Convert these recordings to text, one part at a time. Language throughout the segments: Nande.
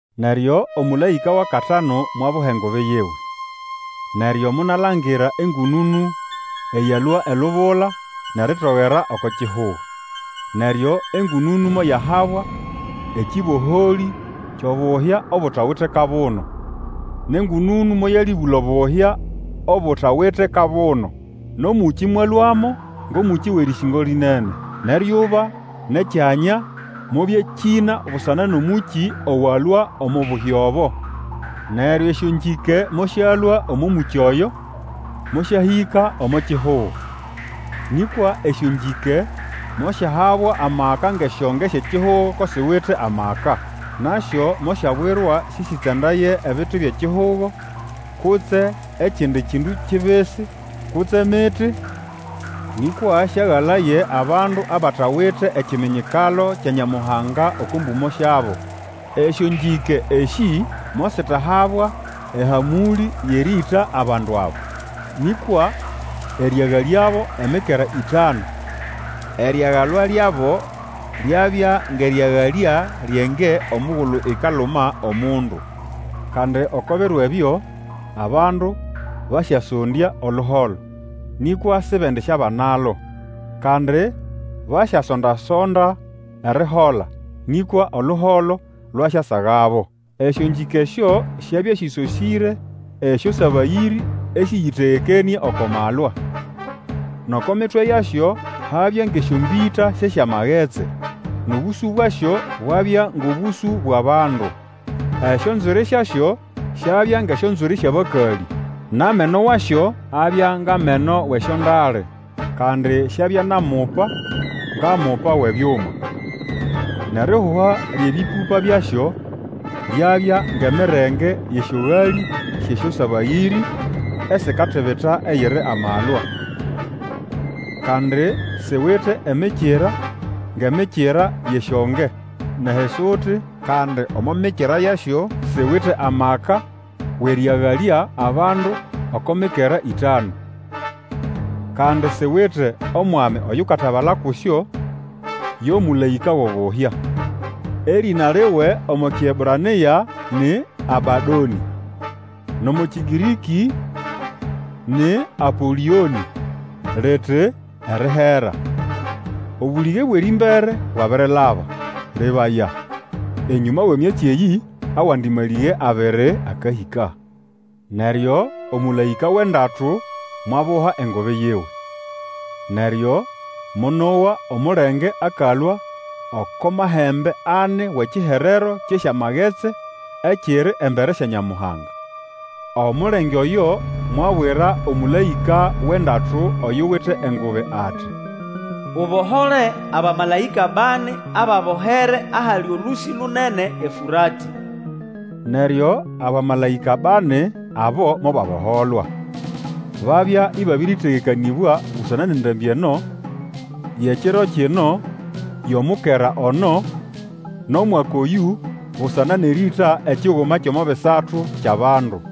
Neryo omũlaĩka wʼakatanu mwabuha engubi yiwe, neryo monalangira engũnũnũ eyalũa elubula nʼeritogera oko kihugo. Neryo engũnũnũ moyahabwa ekĩboholĩ kyʼobuhya obutawite kabuno. Nʼengũnũnũ moyalĩbũla obuhya obutawite kabuno, nʼomũkĩ mwalũamo, ngʼomũkĩ wʼerĩsĩngo lĩnene, nʼeryuba nʼekyanya mobyakĩna busana nʼomũkĩ owalũa omo buhya obo. Neryo esyongĩke mosyalũa omo mũkĩ oyo, mosyahĩka omo kihugo. Nĩkwa esyongĩke mosyahabwa amaka ngʼesyonge syʼekihugo ko siwite amaka. Nasyo mosyabwirwa sĩsĩtsandaye ebiti byʼekihugo, kutse ekindi kindu kibisi, kutse miti, nĩkwa sĩagalaye abandu abatawite ekiminyikalo kya Nyamuhanga oko mbũmo syabo. Esyongĩke esĩ mositahabwa ehamũlĩ yʼerĩĩta abandu aba, nĩkwa erĩagalyabo emikera ĩtanu. Erigalwa lyabo lyabya ngʼerĩagalya lyʼenge omugulu ikaluma omundu. Kandi oko biro ebyo, abandu basyasondya oluholo, nĩkwa sibendisyabanalo, kandi basyasonda-sonda erihola nĩkwa oluholo lwasyasagabo. Esyongĩke esyo syabya sĩsosĩre esyosabayĩrĩ esĩyĩtegekenĩe oko malwa. Nʼoko mitwe yasyo habya ngʼesyombĩta syʼesyamagetsi, nʼobũsũ bwasyo bwabya ngʼobũsũ bwʼabandu. Esyonzwiri syasyo syabya ngʼesyonzwiri syʼabakalĩ, nʼameno wasyo abya ngʼameno wʼesyondale. Kandi syabya nʼamupa ngʼamupa wʼebyuma, nʼerihuha lyʼebĩpũpa byasyo lyabya ngʼemirenge yʼesyogalĩ syʼesyosabayĩrĩ esikatibita eyiri amalwa. Kandi siwite emikira ngʼemikira yʼesyonge, nʼehisuti, kandi omo mikira yasyo siwite amaka wʼerĩagalya bandu oko mikera ĩtanu. Kandi siwite omwami Oyukatabala kusyo, yo mũlaĩka wʼobuhya. Erĩna liwe omo Kiebrania ni Abadonĩ, nʼomo Kĩgĩrĩkĩ ni Apolĩonĩ liti, Erihera. Obũlĩge bwʼerĩmbere bwabirilaba. Lebaya, enyũma wʼemyatsi eyĩ awandi malĩge abiri akahĩka. Neryo omũlaĩka wʼendatu mwabuha engubi yiwe, neryo monowa omulenge akalũa oko mahembe ani wʼekiherero kyʼesyamagetsi ekiri embere sya Nyamuhanga. Omulenge oyo mwabwira omũlaĩka owʼendatu, oyuwite engubi, ati, Ubohole abamalaĩka bani ababohere ahali olũsĩ lunene eFũratĩ. Neryo abamalaĩka bani abo mobaboholwa. Babya ibabiritegekanĩbwa busana nʼendambĩ eno, yʼekiro kino, yʼomukera ono, nʼomwaka oyũ, busana nʼerĩĩta ekiguma kyʼomo bisatu kyʼabandu.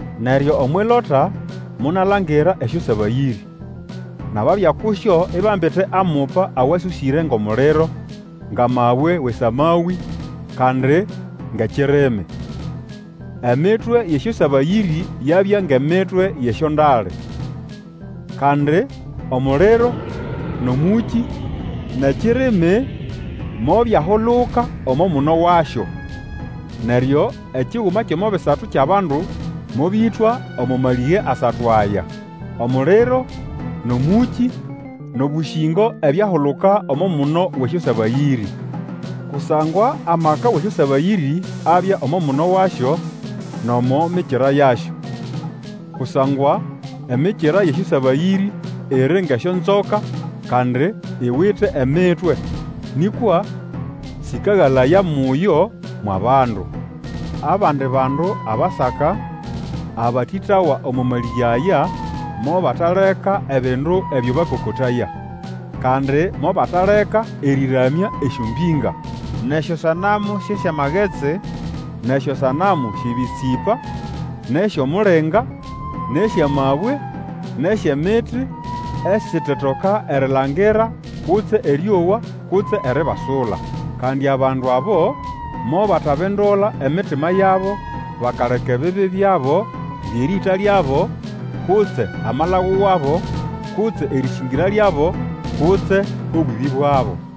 Neryo omwʼilota monalangira esyosabayĩrĩ, nʼababya kusyo, ibambite amupa awasosĩre ngʼomuliro, ngʼamabwe wʼesamawĩ, kandi ngʼekirimi. Emitwe yʼesyosabayĩrĩ yabya ngʼemitwe yʼesyondale. Kandi omuliro, nʼomũkĩ, nʼekirimi mobyahuluka omo muno wasyo. Neryo ekiguma kyʼomo bisatu kyʼabandu mobĩtwa omo malĩge asatu aya: omuliro, nʼomũkĩ, nʼobũsĩngo ebyahuluka omo muno wʼesyosabayĩrĩ. Kusangwa amaka wʼesyosabayĩrĩ abya omo muno wasyo, nʼomo mikira yasyo. Kusangwa emikira yʼesyosabayĩrĩ iri ngʼesyonzoka, kandi iwite emitwe. Nĩkwa sĩkagalaya muyo mwʼabandu. Abandi bandu abasaka, abatĩtawa omo malĩge aya mobataleka ebindu ebyo bakokotaya. Kandi mobataleka erĩramya esyombĩnga, nʼesyosanamu syʼesyamagetsi, nʼesyosanamu syʼebĩtsĩpa, nʼesyʼomulinga, nʼesyʼamabwe, nʼesyʼemiti, esitetoka erilangira kutse erĩowa, kutse eribasula. Kandi abandu abo mobatabindula emitima yabo bakaleka ebibi byabo byʼerĩĩta lyabo, kutse amalagu wabo, kutse erĩsĩngĩra lyabo, kutse obwĩbĩ bwabo.